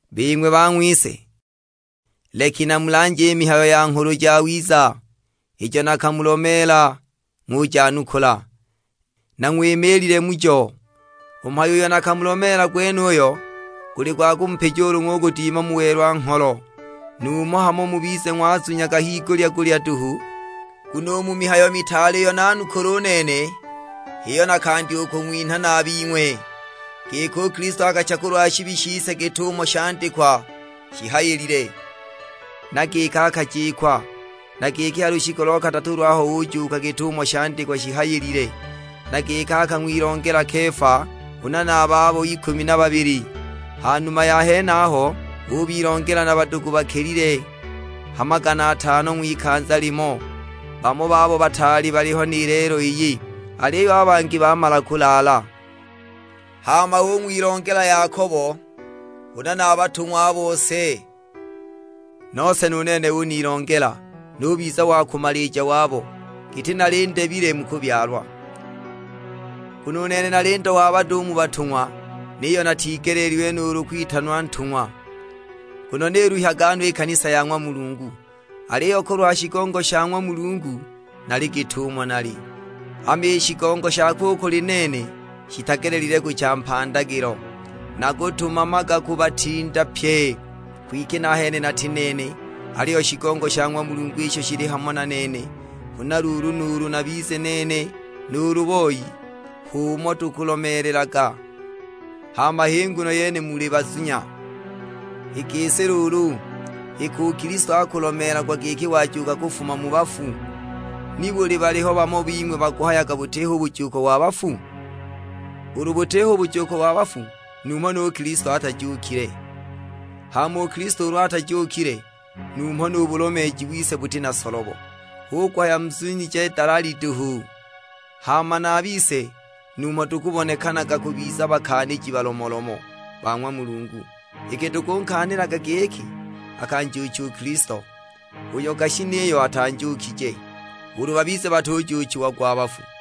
Bing'we bang'wise, leki namulanje i mihayo ya Nghulu Jawiza ijo nakamulomeela ng'ujanukula, na ng'wimiilile mujo. U mhayo uyo nakamulomeela gwenuyo, guli gwa kumupija ulu ng'ugudima mu welwa-ngholo, numho hamo mubize ng'wazunyaga higulya-gulya duhu! Nguno u mu mihayo mitaale iyo nanukula u nene, h'iyo nakandya u kung'winha na a bing'we; giki u Kilisto akacha kulwa shibi shise git'umo shandikwa shihayilile. Na giki akajikwa, na giki ha lushiku lo kadatu lwaho ujuuka git'umo shandikwa shihayilile. Na giki akang'wilongela Kefa, huna na a babo ikumi na babili. Ha numa ya henaho, ubilongela na badugu bakilile ha magana atano ng'wikanza limo. Bamo babo bataali baliho ni lelo iyi, aliyo a bangi bamala kulaala. Hama ung'wilongela Yakobo, huna na a batung'wa a bose. Nose nu nene unilongela, nubiza wa kumalija wabo, giti nali ndebile mu kubyalwa. Nguno u nene nali ndo wa bado u mu batung'wa; niyo natigeleelilwe nuulu kwitanwa ntung'wa, nguno niluhyaga no i kanisa ya ng'wa Mulungu. Aliyo kulwa shigongo sha ng'wa Mulungu nali git'umo nali, hama i shigongo shakwe u kuli nene shitagelelile kucha mpandagilo. Nakutumamaga kubatinda pye, kwike nahene nati nene; aliyo shigongo sha ng'wa Mulungu isho shili hamo na nene. Huna luulu nuulu nabize nene nuulu boi, h'umo tukulomeelelaga; hama h'i nguno yene muli bazunya. I gisi luulu, iki u Kilisto akulomeelagwa giki wajuuka kufuma mu bafu, nibuli baliho bamo bing'we bakuhayaga butiho u bujuuko wa bafu? Ulu butiho u bujuuko wa bafu, numho nu Kilisto atajuukile! Hama u Kilisto ulu atajuukile, numho nu bulomeeji wise buti na solobo, hu kuhaya muzunije dalali duhu. Hama na a bise numho tukubonekana kubiza bakaaniji balomolomo ba ng'wa Mulungu; iki tukunkaanilaga giki akanjuucha u Kilisto, uyo gashi niyo atanjuukije, ulu babize batujuuchiagwa a bafu.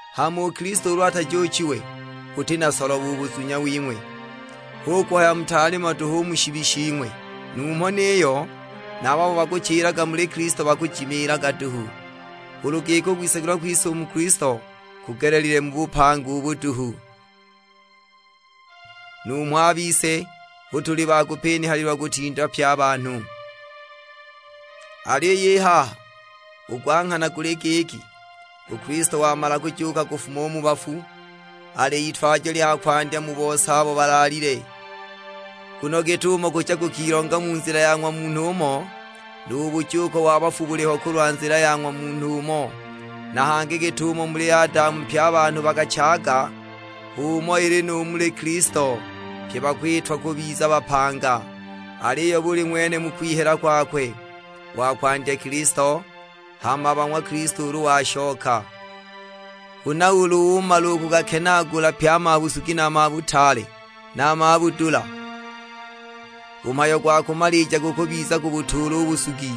Hama u Kilisto ulu atajuuchiwe, buti na solobo u buzunya wing'we, hu kuhaya mutaali mo duhu u mu shibi shing'we! Numho niyo na a babo bakuchilaga muli Kilisto bakujimiilaga duhu. Ulu giki u kwisagilwa kwise u muli Kilisto kugelelile mu bupanga ubu duhu, numho a bise hu tuli ba kupinihalilwa kutinda pye a banhu! Aliyo i haha, u gwa nghana guli giki, u Kilisto wamala kujuuka kufuma u mu bafu, ali Itwajo lya kwandya mu bose abo balaalile. Nguno git'umo kucha kukilonga mu nzila ya ng'wa munhu umo, nu bujuuko wa bafu buliho kulwa nzila ya ng'wa Munhu umo. Na hangi git'umo muli Adamu pye a banhu bakachaaga, h'umo ili nu muli Kilisto; pye bakwitwa kubiza bapanga. Aliyo buli ng'wene mu kwihela kwakwe; wa kwandya Kilisto, hama a ba ng'wa Kilisto ulu washoka. Huna ulu umala u kugakenaagula pye a mabusugi na a mabutaale, na a mabudula, u mhayo gwa kumalija gukubiza kubutuula u busugi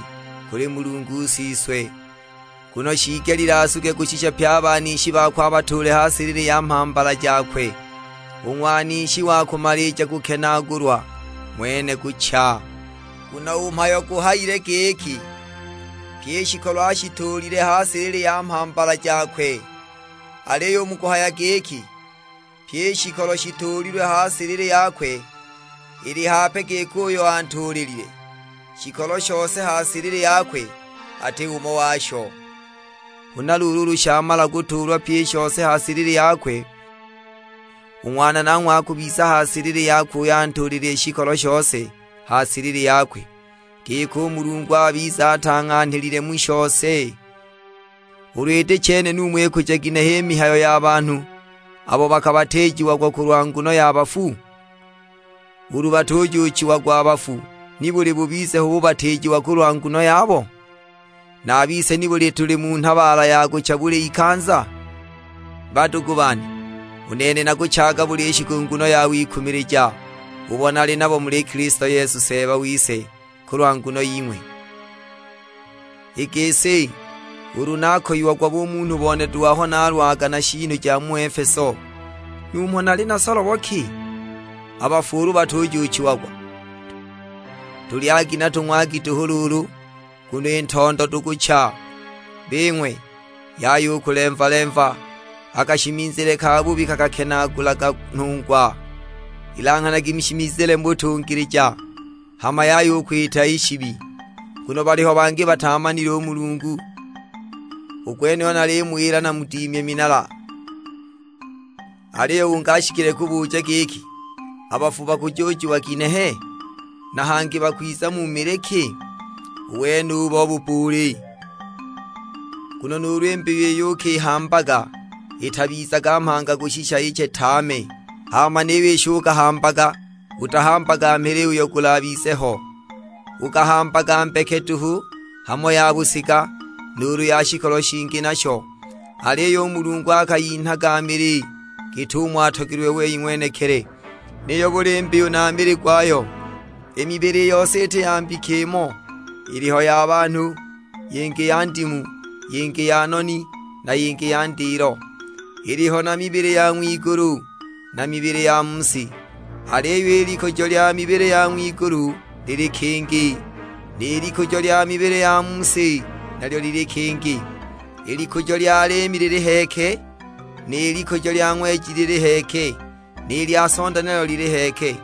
kuli Mulungu Siswe. Nguno shiigelile asuge kushisha pye a banishi bakwe abatuule ha silili ya mhambala jakwe. U ng'wanishi wa kumalija kukenaagulwa ng'wene kucha. Nguno u mhayo guhayile giki, "Pyi i shikolo ashituulile ha silili ya mhambala jakwe." Aliyo u mu kuhaya giki, "Pyi i shikolo shituulilwe ha silili yakwe," ili hape giki uyo antuulilile shikolo shose ha silili yakwe ati umo washo. Huna luulu ulu shamala kutuulwa pyi i shose ha silili yakwe, u Ng'wana nanghwe akubiza ha silili yakwe uyo antuulilile shikolo shose ha silili yakwe, giki u Mulungu abize atang'anhilile mu shose. Ulu iti chene numho ikuja ginehe i mihayo ya banhu abo bakabatiijiagwa kulwa nguno ya bafu? Ulu batujuuchiagwa a bafu, nibuli bubize ho bubatiijiwa kulwa nguno yabo? Na a bise nibuli tuli mu nhabaala ya kucha buli ikanza? Badugu bane, u nene nakuchaaga buli shiku nguno ya wikumilija, ubo nali nabo muli Kilisto Yesu Seeba wise kulwa nguno ying'we. I gisi, ulu nakoiagwa bumunhu bone duhu aho nalwaga na shiinu ja mu Efeso, numho nali na solobo ki? A bafu ulu batujuuchiagwa, "Tulyagi na tung'wagi duhu luulu, nguno i ntondo tukucha!" Bing'we, yaya u kulemva-lemva; a kashimizile kabubi kakakenaagulaga nhungwa. Ilanghanagi mushimizile mu butungilija, hama yaya u kwita i shibi; nguno baliho bangi bataamanile u Mulungu. U gwenuyu nalimuwila namudimye minala. Aliyo ungi ashikile kubuja giki, "A bafu bakujuuchiwa ginehe? Na hangi bakwiza mu mili ki?" U wenubo bubbuuli! Nguno nuulu i mbiyu iyo ukihambaga itabizaga mhanga kushisha iche tame! Hama niyo isho ukahambaga utahambaga mili uyo gulabize ho, ukahambaga mbeke duhu; hamo ya busiga, nuulu ya shikolo shingi nasho. Aliyo u Mulungu akayinhaga mili git'umo atogelilwe wei ng'wenekili, niyo buli mbiyu na mili gwayo. I mibili i yose iti ya mbika imo, iliho ya banhu, yingi ya ndimu, yingi ya noni, na yingi ya ndilo. Iliho na mibili ya ng'wigulu, na mibili ya mu si. Aliyo i likujo lya mibili ya ng'wigulu lili kingi, ni likujo lya mibili ya mu si nalyo lili kingi. I likujo lya liimi lili heeke, ni likujo lya ng'weji lili heeke, ni lya sonda nalyo lili heeke;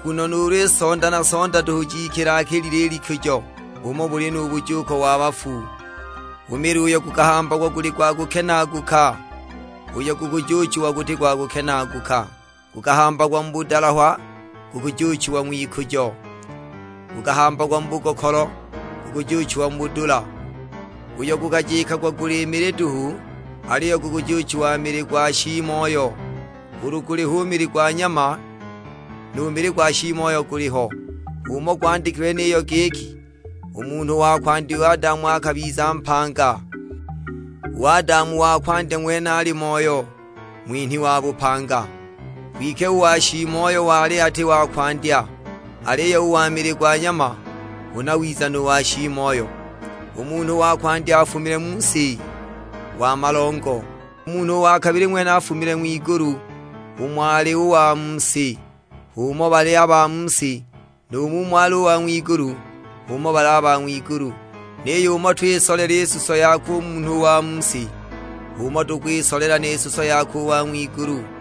nguno nuulu i sonda na sonda duhu jikila-kilile i likujo. H'umo buli nu bujuuko wa bafu, u mili uyo gukahambagwa guli gwa kukenaaguka, uyo gukujuuchiwa guti gwa kukenaaguka. Gukahambagwa mu budalahwa, gukujuuchiwa ng'wikujo; gukahambagwa mu bugokolo, gukujuuchiwa mu budula. Uyo gukajikagwa guli mili duhu, aliyo gukujuuchiwa mili gwa shiimoyo; ulu guliho u mili gwa nyama, nu mili gwa shiimoyo guliho. H'umo gwandikilwe niyo; giki, "U munhu wa kwandya u Adamu, akabiza mpanga." U Adamu wa kumalija ng'wene ali Moyo, ng'winhi wa bupanga. Kwike u wa shiimoyo wali ati wa kwandya, aliyo u wa mili gwa nyama; huna wiza nu wa shiimoyo. U munhu wa kwandya afumile mu si, wa malongo; u Munhu wa kabili ng'wene afumile ng'wigulu. Umo ali u wa mu si, h'umo bali a ba mu si, nu mumo ali u wa ng'wigulu, h'umo bali a ba ng'wigulu. Niyo umo twisolela i suso yakwe u munhu wa mu si, h'umo tukwisolela ni suso yakwe u wa ng'wigulu.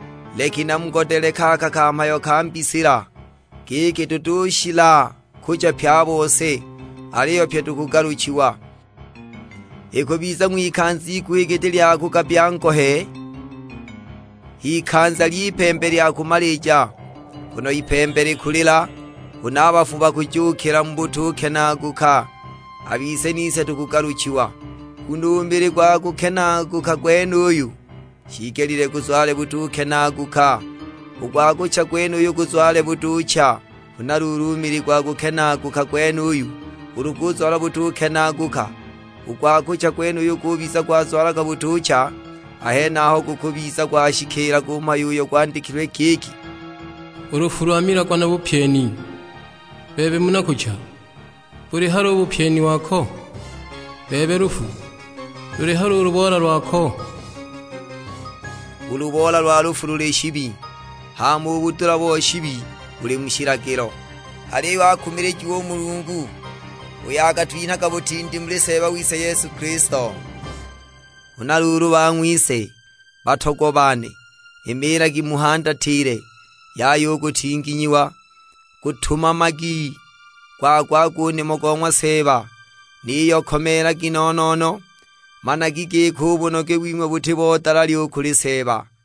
Leki namugodele kaka kamhayo ka mbisila: giki, tutushila kucha pye a bose, aliyo pyi tukugaluchiwa. Ikubiza ng'wikanza iguhi giti lya kugabbya ngohe, h'ikanza ly'ipembe lya kumalija. Nguno ipembe likulila, huna a bafu bakujuukila mu butukenaaguka, a bise nise tukugaluchiwa. Nguno u mili gwa kukenaaguka gwenuyu shiigelile guzwale butukenaaguka, u gwa kucha gwenuyu guzwale butuucha. Huna luulu u mili gwa kukenaaguka gwenuyu ulu guzwala butukenaaguka, u gwa kucha gwenuyu gubiza gwazwala butucha, a henaho gukubiza gwashikiila u mhayo uyo gwandikilwe giki, "U lufu lwamilagwa na bupyeni. Bebe muna kucha buli hali u bupyeni wako? Bebe lufu luli hali u luboola lwako?" U luboola lwa lufu luli shibi, hama u budula bo shibi buli mu shilagilo. Aliyo akumilijiwe u Mulungu, uyo akatwinhaga butindi muli Seeba wise Yesu Kilisto. Huna luulu bang'wise, batogwa bane; imiilagi muhandatile, yaya u kutinginyiwa. Gutumamagi gwa-gwa-gwa u nimo go ng'wa Seeba, niyo komeelagi no-no-no; managi giki u bunoge wing'we buti bo dalali u kuli Seeba.